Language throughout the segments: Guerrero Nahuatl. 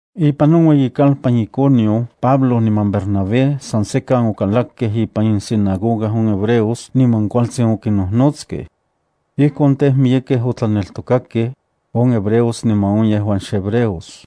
Ipan on ueyikalpan Iconio Pablo niman Bernabé san sekan okalakkej ipan insinagoga on hebreos niman kualtsin okinnojnotskej. Ijkon tej, miyekej otlaneltokakej, on hebreos niman on yejuan xhebreos.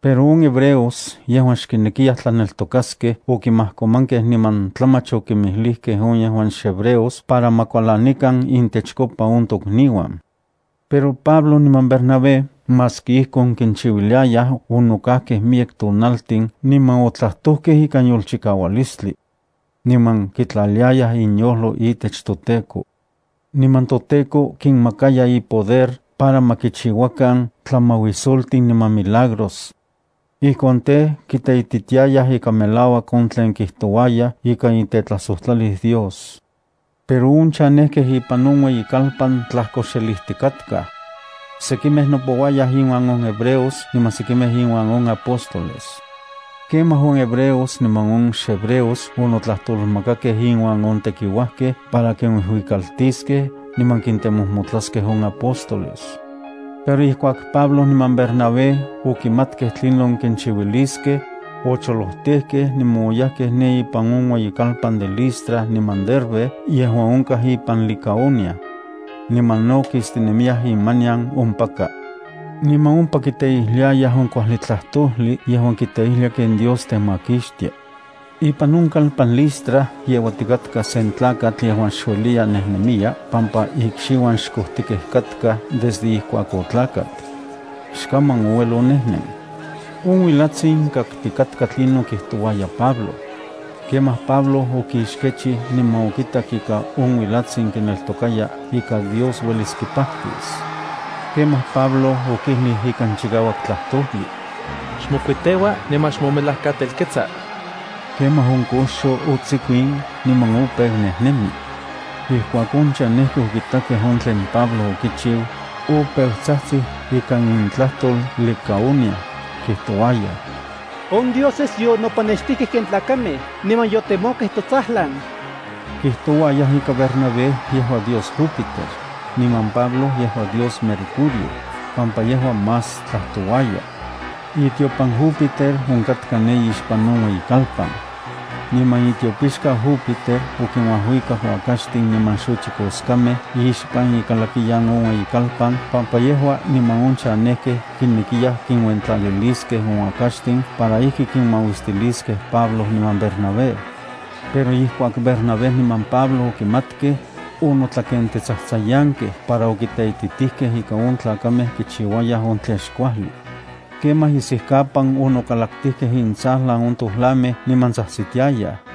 Pero on hebreos yejuan xkinekiyaj tlaneltokaskej okimajkomankej niman tlamach okinmijlijkej on yejuan xhebreos para ma kualanikan intechkopa on tokniuan. Pero Pablo niman Bernabé onokajkej miyek tonaltin niman otlajtojkej ikan yolchikaualistli. Niman kitlaliayaj inyojlo itech toTEKO. Niman toTEKO kinmakaya ipoder para ma kichiuakan tlamauisoltin niman milagros. Ijkon tej, kiteititiayaj ika melauak on tlen kitouayaj ika itetlajsojtlalis Dios. Pero on chanejkej ipan on ueyikalpan tlajkoxelijtikatkaj. Sekimej nopouayaj inuan on hebreos niman sekimej inuan on apóstoles. Kemaj on hebreos niman on xhebreos onotlajtolmakakej inuan on tekiuajkej para kinuijuikaltiskej niman kintemojmotlaskej on apóstoles. Pero ijkuak Pablo niman Bernabé okimatkej tlinon kinchiuiliskej, ocholojtejkej niman oyajkej ne ipan on ueyitlalpan de Listra niman Derbe yejuan onkaj ipan Licaonia. Niman no kistinemiyaj imanian ompaka. Niman ompa kiteijliayaj on kuajli tlajtojli yejuan kiteijlia ken Dios temakixtia. Ipan on kalpan Listra yeuatikatka sen tlakatl yejuan xueliya nejnemiya pampa ikxiuan xkojtikej katka desde ijkuak otlakat. Xkaman ouel onejnen. On uilatsin kaktikatka tlinon kijtouaya Pablo. Kemaj Pablo okixkechij niman okitak ika on uilatsin kineltokaya ika Dios uelis kipajtis. Kemaj Pablo okijlij ikan chikauak tlajtojli: —Xmokuiteua niman xmomelajkatelketsa. Kemaj on koxo otsikuin niman opeu nejnemi. Ijkuak on chanejkej okitakej on tlen Pablo okichiu, opeu tsajtsij ikan intlajtol Licaonia, kijtouayaj: —¡On dioses yonopanextijkej ken tlakamej niman yotemokej totsajlan! Kijtouayaj ika Bernabé yejua dios Júpiter, niman Pablo yejua dios Mercurio, pampa yejua más tlajtlajtouaya. Itiopan Júpiter onkatka ne ixpan on ueyikalpan. Niman itiopixkau Júpiter okinuajuikak uakaxtin niman xochikoskamej ixpan ikalakiyan on ueyikalpan pampa yejua niman on chanejkej kinekiyaj kinuentlaliliskej on uakaxtin para ijki kinmauistiliskej Pablo niman Bernabé. Pero ijkuak Bernabé niman Pablo okimatkej, onotlakentetsajtsayankej para okiteititijkej ika on tlakamej kichiuayaj on tlen xkuajli. Kemaj isijkapan onokalaktijkej intsajlan on tojlamej niman tsajtsitiayaj: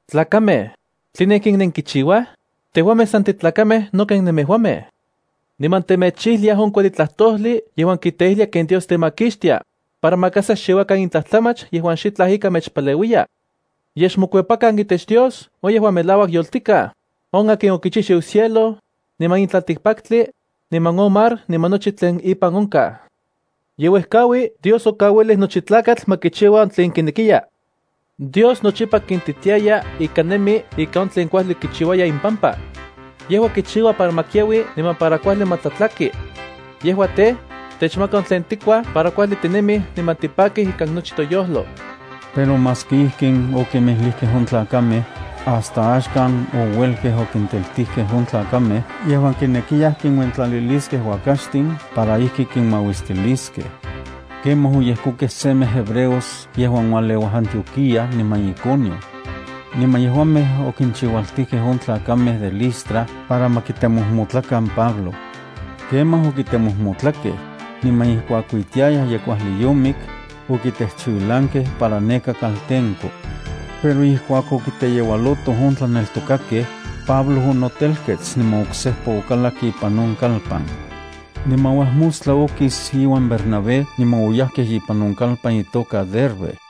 —Tlakamej, ¿tline ijkin nenkichiuaj? Tejuamej san titlakamej no ken nemejuamej. Niman temechijliaj on kuajli tlajtojli yejuan kiteijlia ken Dios temakixtia, para maka sa xchiuakan in tlajtlamach yejuan xitlaj ika mechpaleuiya. Yej xmokuepakan itech Dios on yejuan melauak yoltikaj, on akin okichijchiu cielo, niman in tlaltikpaktli, niman on mar niman nochi tlen impan onkaj. Yeuejkaui Dios okauilij nochi tlakatl ma kichiua on tlen kinekiya. Dios nochipa kintitiaya ika nemi ika on tlen kuajli kichiuaya impampa. Yejua kichiua para ma kiaui niman para kuajli ma tlatlaki. Yejua tej, techmaka on tlen tikuaj para kuajli tinemij niman tipakij ikan nochi toyojlo. Pero maski ijkin okimilijkej on tlakamej, hasta axkan ouelkej okinteltijkej on tlakamej yejuan kinekiyaj kinuentlaliliskej uakaxtin para ijki kinmauistiliskej. Kemaj oyejkokej semej hebreos yejuan ualeuaj Antioquía niman Iconio. Niman yejuamej okinchiualtijkej on tlakamej de Listra para ma kitemojmotlakan Pablo. Kemaj okimojmotlakej, niman ijkuak kuitiayaj ye kuajli yomik, okitejchiuilankej para neka kaltenko. Pero ijkuak okiteyeualotoj on tlaneltokakej, Pablo onotelkets niman oksejpa okalak ipan on kalpan. Niman uajmostla okis iuan Bernabé niman oyajkej ipan on kalpan itoka Derbe.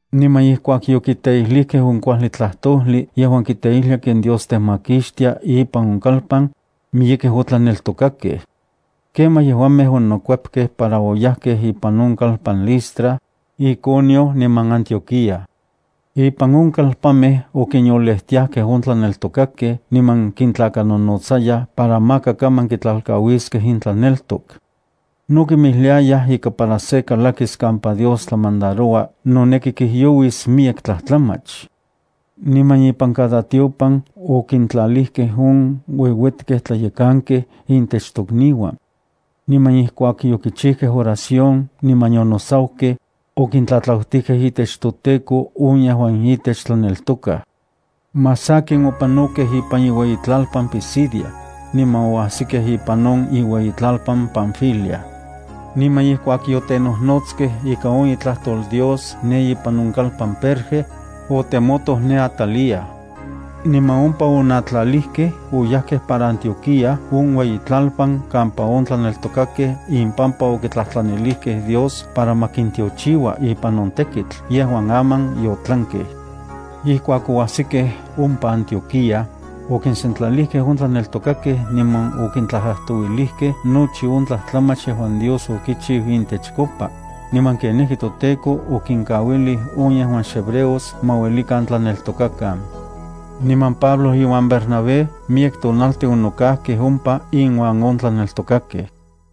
Niman ijkuak yokiteijlijkej on kuajli tlajtojli yejuan kiteijlia ken Dios temakixtia ipan on kalpan, miyekej otlaneltokakej. Kemaj yejuamej onokuepkej para oyajkej ipan on kalpan Listra, Iconio niman Antioquía. Ipan on kalpanmej okinyolejtiajkej on tlaneltokakej niman kintlakanonotsayaj para maka kaman kitlalkauiskej intlaneltok. No kinmijliayaj ika para se kalakis kampa Dios tlamandaroua noneki kijyouis miyek tlajtlamach. Niman ipan cada tiopan okintlalijkej on ueuetkej tlayekankej intech tokniuan. Niman ijkuak yokichijkej oración niman yonosaukej, okintlatlautijkej itech toTEKO on yejuan itech tlaneltokaj. Más sakin opanokej ipan iueyitlalpan Pisidia, niman oajsikej ipan on ueyitlalpan Panfilia. Niman ijkuak yotenojnoskej ika on itlajtol Dios ne ipan on kalpan Perge, otemotoj ne Atalía. Niman ompa onatlalijkej oyajkej para Antioquía on ueyikalpan kampa on tlaneltokakej impampa okitlajtlanilijkej Dios para ma kintiochiua ipan on tekitl yejuan aman yotlankej. Ijkuak oajsikej ompa Antioquía, okinsentlalijkej on tlaneltokakej niman okintlajtlajtouilijkej nochi on tlajtlamach yejuan Dios okichiu intechkopa, niman kenijki toTEKO okinkauilij on yejuan xhebreos ma uelikan tlaneltokakan. Niman Pablo iuan Bernabé miyek tonaltin onokajkej ompa inuan on tlaneltokakej.